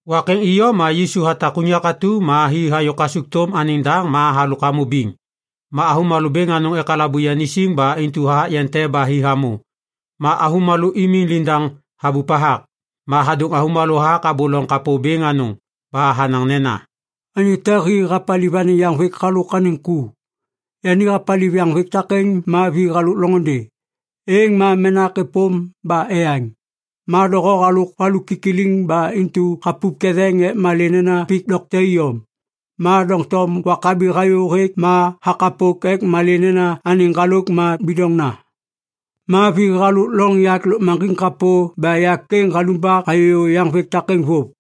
Wak êŋ iyom ma Yisu hatak unyak atu ma hi hayô kasukthôm anêŋ daŋ ma halôk hamô biŋ. Ma avômalô bêŋ anôŋ ekalabu yani siŋ ba intu hathak yeŋ te ba hi hamô, ma avômalô imiŋ liŋdaŋ habup hathak. Ma hadôŋ avômalô hathak abô loŋ kapô bêŋ anôŋ. Ba hanaŋ nena, “Anyô te hi hapaliv anêŋ yaŋvêk halôk anêŋ ku. Yani hapaliv yaŋvêk takêŋ ma vi halôk loŋôndê. Êŋ ma menak êpôm ba eyaŋ. Ma doho halôk valu kikiliŋ ba intu hapup ketheŋ ek malê nena pik dokte iyom. Ma doŋtom wak habi hayô hêk ma hakapok ek malê nena anêŋ ŋgalôk ma bidoŋna. Ma vi halôk loŋ yak lôkmaŋgiŋ kapô ba yak êŋ halumbak hayô yaŋvêk takêŋ vôv.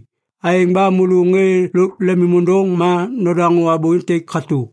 Aêŋ ba môlô ŋê lôk lemôndôŋ ma nodaŋô abô êntêk katô!”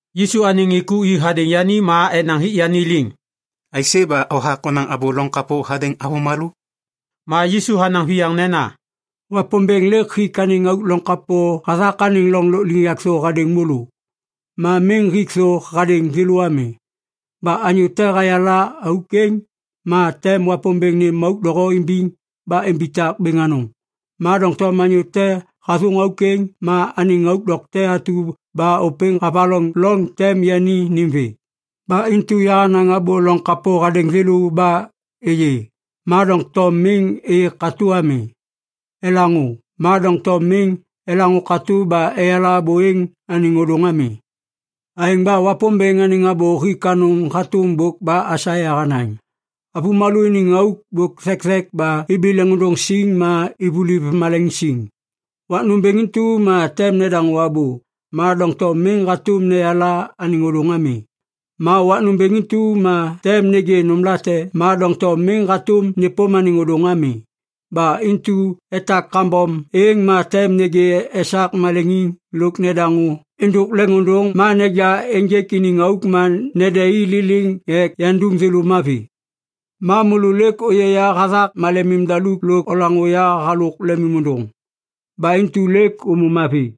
Yisu anêŋ ŋê ku i hadêŋ yani ma enaŋ hik yani liŋ, “Aisê ba hothak honaŋ abô loŋ kapô hadêŋ avômalô?” Ma Yisu hanaŋ viyaŋ nena, “Wapômbêŋ lêk hik anêŋ auk loŋ kapô hathak anêŋ loŋ lôkliŋyak thô hadêŋ môlô. Ma miŋ hik thô hadêŋ thêlô ami. Ba anyô te hayala auk êŋ, ma tem Wapômbêŋ nêm auk doho imbiŋ ba imbitak bêŋ anôŋ. Ma doŋtom anyô te hathôŋ auk êŋ, ma anêŋ auk dokte atu ba ôpêŋ havaloŋ loŋ tem yani nêm vê. Ba intu yahanaŋ abô loŋ kapô hadêŋ thêlô ba “Êyê, ma doŋtom miŋ êyê katô ami. Elaŋô, ma doŋtom miŋ elaŋô katô ba eyala abô êŋ anêŋ ôdôŋ ami. Aêŋ ba Wapômbêŋ anêŋ abô hik anôŋ hatôm bôk ba Aisaia hanaŋ, “‘Avômalô iniŋ auk bôk thekthek ba ibi leŋôndôŋ siŋ ma ivuliv maleŋiŋ siŋ. Wak nômbêŋ intu ma tem nedaŋô abô, ma doŋtom miŋ hatôm neyala anêŋ ôdôŋ ami. Ma wak nômbêŋ intu ma tem nêgê nômlate, ma doŋtom miŋ hatôm nêpôm anêŋ ôdôŋ ami. Ba intu etak kambom êŋ ma tem nêgê esak maleŋiŋ lôk nedaŋô êndôk leŋôndôŋ ma neja ênjêk iniŋ auk ma nede i liliŋ ek yandum thêlô mavi.’ Ma môlô lêk ôyê ya hathak malemim daluk lôk olaŋô ya halôk lemim ôndôŋ. Ba intu lêk ômô mavi.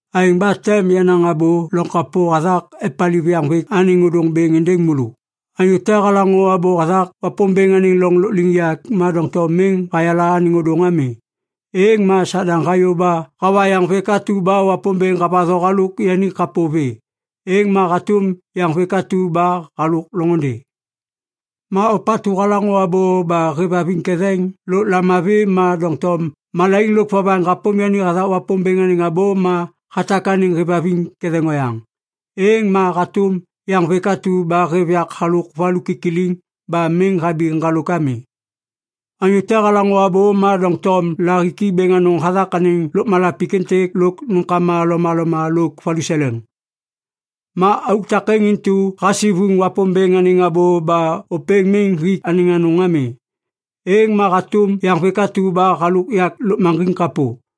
“Aêŋ ba tem yanaŋ abô loŋ kapô hathak epaliv yaŋvêk anêŋ ôdôŋ bêŋ êndêŋ môlô. Anyô te halaŋô abô hathak Wapômbêŋ anêŋ loŋ lôkliŋyak ma doŋtom miŋ hayala anêŋ ôdôŋ ami, êŋ ma Sadaŋ hayô ba hawa yaŋvêk atu ba Wapômbêŋ havatho halôk yani kapô vê. Êŋ ma hatôm yaŋvêk atu ba halôk loŋôndê. “Ma ôpatu halaŋô abô ba hêvhaviŋ ketheŋ lôk lamavi ma doŋtom malaiŋ lôk vovaŋ hapôm yani hathak Wapômbêŋ anêŋ abô ma hatak anêŋ hêvhaviŋ ketheŋ oyaŋ, êŋ ma hatôm yaŋvêk atu ba hêv yak halôk valu kikiliŋ ba miŋ habi ŋgalôk ami. “Anyô te halaŋô abô ma doŋtom lahiki bêŋ anôŋ hathak anêŋ lôkmala pik êntêk lôk nômkama lomaloma lôk valuseleŋ. Ma auk takêŋ intu hasivuŋ Wapômbêŋ anêŋ abô ba ôpêŋ miŋ hik anêŋ anôŋ ami. Êŋ ma hatôm yaŋvêk atu ba halôk yak lôkmaŋgiŋ kapô.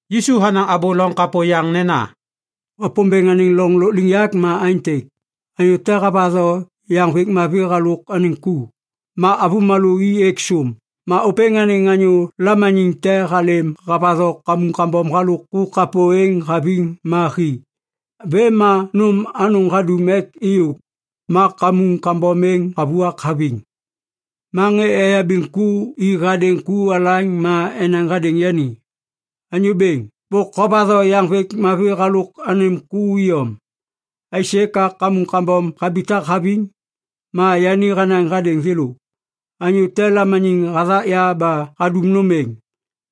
Yisu hanaŋ abô loŋ kapô yaŋ nena, “Wapômbêŋ anêŋ loŋ lôkliŋyak ma aêntêk. Anyô te havatho yaŋvêk mavi halôk anêŋ ku. Ma avômalô i êk sôm, ma ôpêŋ anêŋ anyô lamaniŋ te halêm havatho kamuŋ kambom halôk ku kapô êŋ haviŋ ma hi. Vêm ma nôm anôŋ hadum ek êyôk, ma kamuŋ kambom êŋ havuak haviŋ. Ma ŋê eyabiŋ ku i hadêŋ ku alaŋ ma enaŋ hadêŋ yani, ‘Anyô bêŋ, bôk hovatho yaŋvêk mavi halôk anêm ku iyom. Aisê ka kamuŋ kambom habitak haviŋ?’ “Ma yani hanaŋ hadêŋ thêlô, ‘Anyô te lamaniŋ hathak ya ba hadum nôm êŋ.’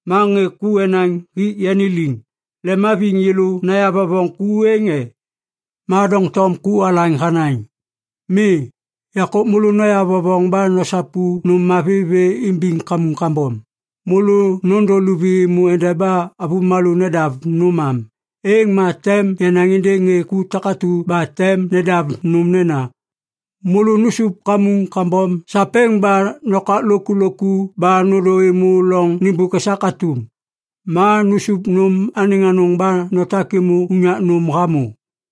“Ma ŋê ku enaŋ hik yani liŋ, ‘Lemhaviŋ yêlô nayavovoŋ ku êŋ e?’ “Ma doŋtom ku alaŋ hanaŋ, ‘Mi. Yahakô môlô noyavovoŋ ba nosapu nôm mavi vê imbiŋ kamuŋ kambom. Môlô nôndô luvi êmô endeba avômalô nedav nôm am. Êŋ ma tem yanaŋ êndêŋ ŋê ku takatu ba tem nedav nôm nena, “Môlô nusup kamuŋ kambom sapêŋ ba nokak lôkulôku ba nôndô êmô loŋ nêmbôk esak atum. Ma nusup nôm anêŋ anôŋ ba notak êmô unyak nôm hamô.”’”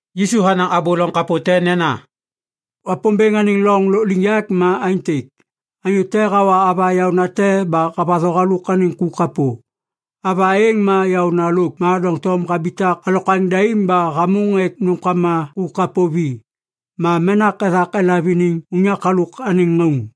Yisu hanaŋ abô loŋ kapô te nena, “Wapômbêŋ anêŋ loŋ lôkliŋyak ma aêntêk. Anyô te hawa ava yaônate ba havatho halôk anêŋ ku kapô. Ava êŋ ma yaôna lôk, ma doŋtom habitak alokwaŋ daim ba hamôŋ ek nômkama ku kapô vi. Ma menak ethak elav iniŋ unyak halôk anêŋ ŋauŋ.”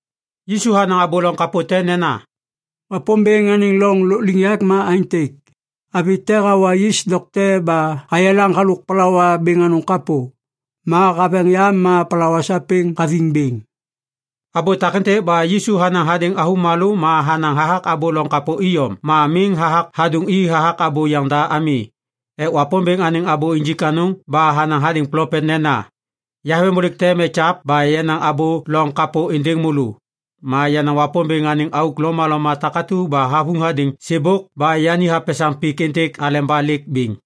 Yisu hanaŋ abô loŋ kapô te nena, “Wapômbêŋ anêŋ loŋ lôkliŋyak ma aêntêk. Avi te hawa yis dokte ba hayelaŋ halôk palawa bêŋ anôŋ kapô, ma haveŋ yam ma palawa sapêŋ hathiŋ bêŋ.” Abô takêntêk ba Yisu hanaŋ hadêŋ avômalô ma hanaŋ hathak abô loŋ kapô iyom ma miŋ hathak hadôŋ i hathak abô yaŋda ami ek Wapômbêŋ anêŋ abô injik anôŋ ba hanaŋ hadêŋ plopet nena, “Yaveŋbôlêk tem ekyav ba yanaŋ abô loŋ kapô êndêŋ môlô. Ma yanaŋ Wapômbêŋ anêŋ auk lomaloma takatu ba havuŋ hadêŋ sêbôk ba yani hapesaŋ pik êntêk aleba lêk bêŋ.”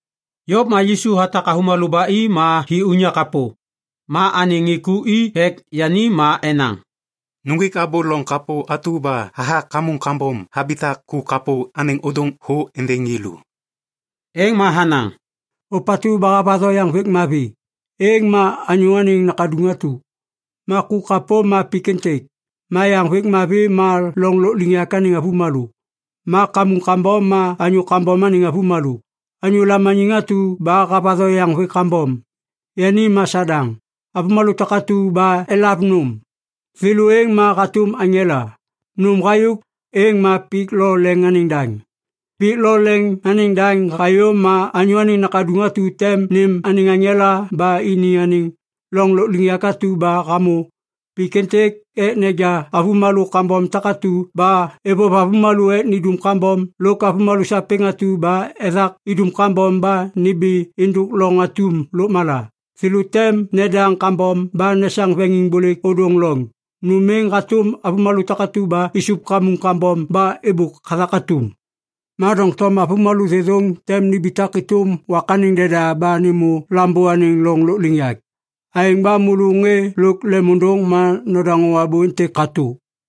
Yôv ma Yisu hatak avômalô ba i ma hi unyak kapô. Ma anêŋ ŋê ku i ek yani ma enaŋ, “Nuŋgwik abô loŋ kapô atu ba hathak kamuŋ kambom habitak ku kapô anêŋ ôdôŋ thô êndêŋ yêlô.” Êŋ ma hanaŋ, “Ôpatu ba havatho yaŋvêk mavi, êŋ ma Anyô Anêŋ Nakaduŋ atu. Ma ku kapô ma pik êntêk, ma yaŋvêk mavi ma loŋ lôkliŋyak anêŋ avômalô, ma kamuŋ kambom ma anyô kambom anêŋ avômalô. Anyô lamaniŋ atu ba havatho yaŋvêk kambom, yani ma Sadaŋ. Avômalô takatu ba elav nôm, thêlô êŋ ma hatôm aŋela. Nôm hayôk, êŋ ma pik lo leŋ anêŋ daŋ. “Pik lo leŋ anêŋ daŋ hayô ma Anyô Anêŋ Nakaduŋ atu tem nêm anêŋ aŋela ba ini anêŋ loŋ lôkliŋyak atu ba hamô pik êntêk ek neja avômalô kambom takatu ba êvôv avômalô ek nindum kambom lôk avômalô sapêŋ atu ba ethak idum kambom ba nimbi êndôk loŋ atum lôkmala. Thêlô tem nedaŋ kambom ba nesaŋ veŋiŋbôlêk ôdôŋ loŋ. Nôm êŋ hatôm avômalô takatu ba isup kamuŋ kambom ba êbôk hathak atum. “Ma doŋtom avômalô thêthôŋ tem nimbitak êtôm wak anêŋ deda ba nêmô Lambô anêŋ loŋ lôkliŋyak. Aêŋ ba môlô ŋê lôk lemôndôŋ ma nodaŋô abô êntêk katô!”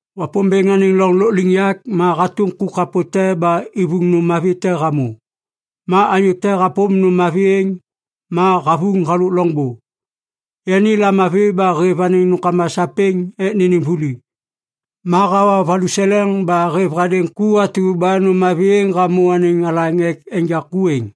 “Wapômbêŋ anêŋ loŋ lôkliŋyak ma hatôm ku kapo te ba ivuŋ nôm mavi te hamô. Ma anyô te hapôm nôm mavi êŋ. Ma havuŋ halôk loŋbô. Yani lamavi ba hêv anêŋ nômkama sapêŋ ek nênêm vuli. Ma hawa valuseleŋ ba hêv hadêŋ ku atu ba nôm mavi êŋ hamô anêŋ alaŋ ek enja ku êŋ.”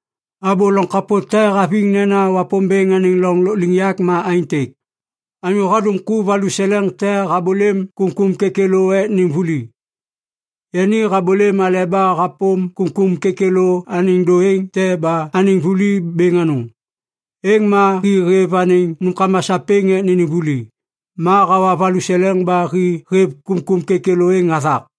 “Abô loŋ kapô te haviŋ nena Wapômbêŋ anêŋ loŋ lôkliŋyak ma aêntêk. Anyô hadum ku valuseleŋ te habôlêm kômkôm kêkêlô ek nêm vuli. Yani habôlêm aleba hapôm kômkôm kêkêlô anêŋ dôêŋ te ba anêŋ vuli bêŋ anôŋ. Êŋ ma hi hêv anêŋ nômkama sapêŋ ek nênêm vuli. Ma hawa valuseleŋ ba hi hêv kômkôm kêkêlô êŋ hathak.”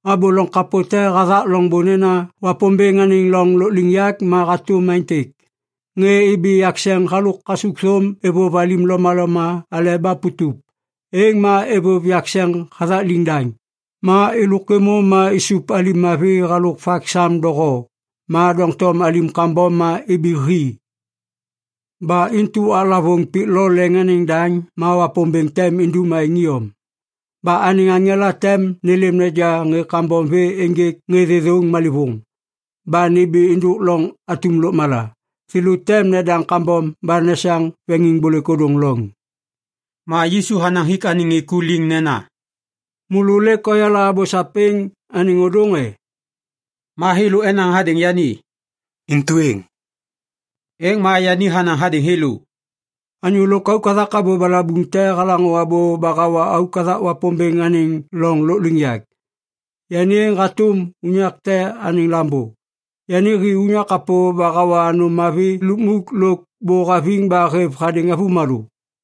“Abô loŋ kapô te hathak loŋbô nena Wapômbêŋ anêŋ loŋ lôkliŋyak ma hatôm aêntêk. Ŋê ibi yakseŋ halôk kasukthôm êvôv alim lomaloma aleba putup. Êŋ ma êvôv yakseŋ hathak liŋdaŋ. Ma êlôk êmô ma isup alim mavi halôk vak sam doho. Ma doŋtom alim kambom ma ibi hi. Ba intu waklavôŋ pik lo leŋ anêŋ daŋ ma Wapômbêŋ tem indum aêŋ iyom. Ba anêŋ aŋela tem nêlêm neja ŋê kambom vê ênjêk ŋê thêthôŋ malêvôŋ ba nimbi êndôk loŋ atum lôkmala. Thêlô tem nedaŋ kambom ba nesaŋ veŋiŋbôlêk ôdôŋ loŋ.” Ma Yisu hanaŋ hik anêŋ ŋê ku liŋ nena, “Môlô lêk oyala abô sapêŋ anêŋ ôdôŋ e?” Ma thêlô enaŋ hadêŋ yani, “Intu êŋ.” Êŋ ma yani hanaŋ hadêŋ thêlô, “Anyô lôkauk hathak abô balabuŋ te halaŋô abô ba hawa auk hathak Wapômbêŋ anêŋ loŋ lôkliŋyak, yani êŋ hatôm unyak te anêŋ lambô. Yani hi unyak kapô ba hawa nôm mavi lukmuk lôk bô haviŋ ba hêv hadêŋ avômalô.”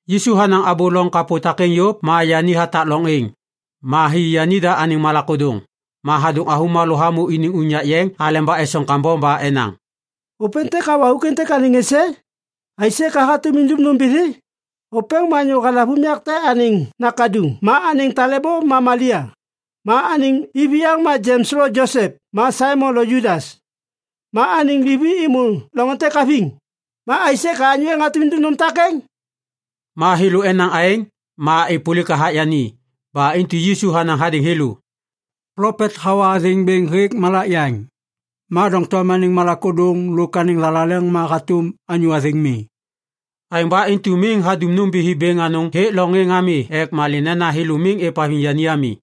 Yisu hanaŋ abô loŋ kapô takêŋ yôv ma yani hatak loŋ êŋ. Ma hi yanida anêŋ malak ôdôŋ. Ma hadôŋ avômalô hamô iniŋ unyak yeŋ aleba esoŋ kambom ba enaŋ, “Ôpêntêk hawa auk êntêk anêŋ êsê? Aisê ba yani hatôm idum nômbithi? Ôpêŋ ma anyô halav unyak te anêŋ nakaduŋ ma anêŋ talêbô ma Malia. Ma anêŋ iviyaŋ ma Jems lo Josep ma Saimon lo Judas. Ma anêŋ livi êmô loŋ êntêk haviŋ. Ma aisê ka anyô êŋ hatôm idum nôm takêŋ?” Ma thêlô enaŋ aêŋ, ma êpôlik hathak yani. Ba intu Yisu hanaŋ hadêŋ thêlô, “Plopet hawa athêŋ bêŋ hêk malak yaŋ. Ma doŋtom anêŋ malak ôdôŋ lôk anêŋ thalaleŋ ma hatôm anyô athêŋ mi.” Aêŋ ba intu miŋ hadum nômbithi bêŋ anôŋ hêk loŋ êŋ ami ek malê nena thêlô miŋ êvhaviŋ yani ami.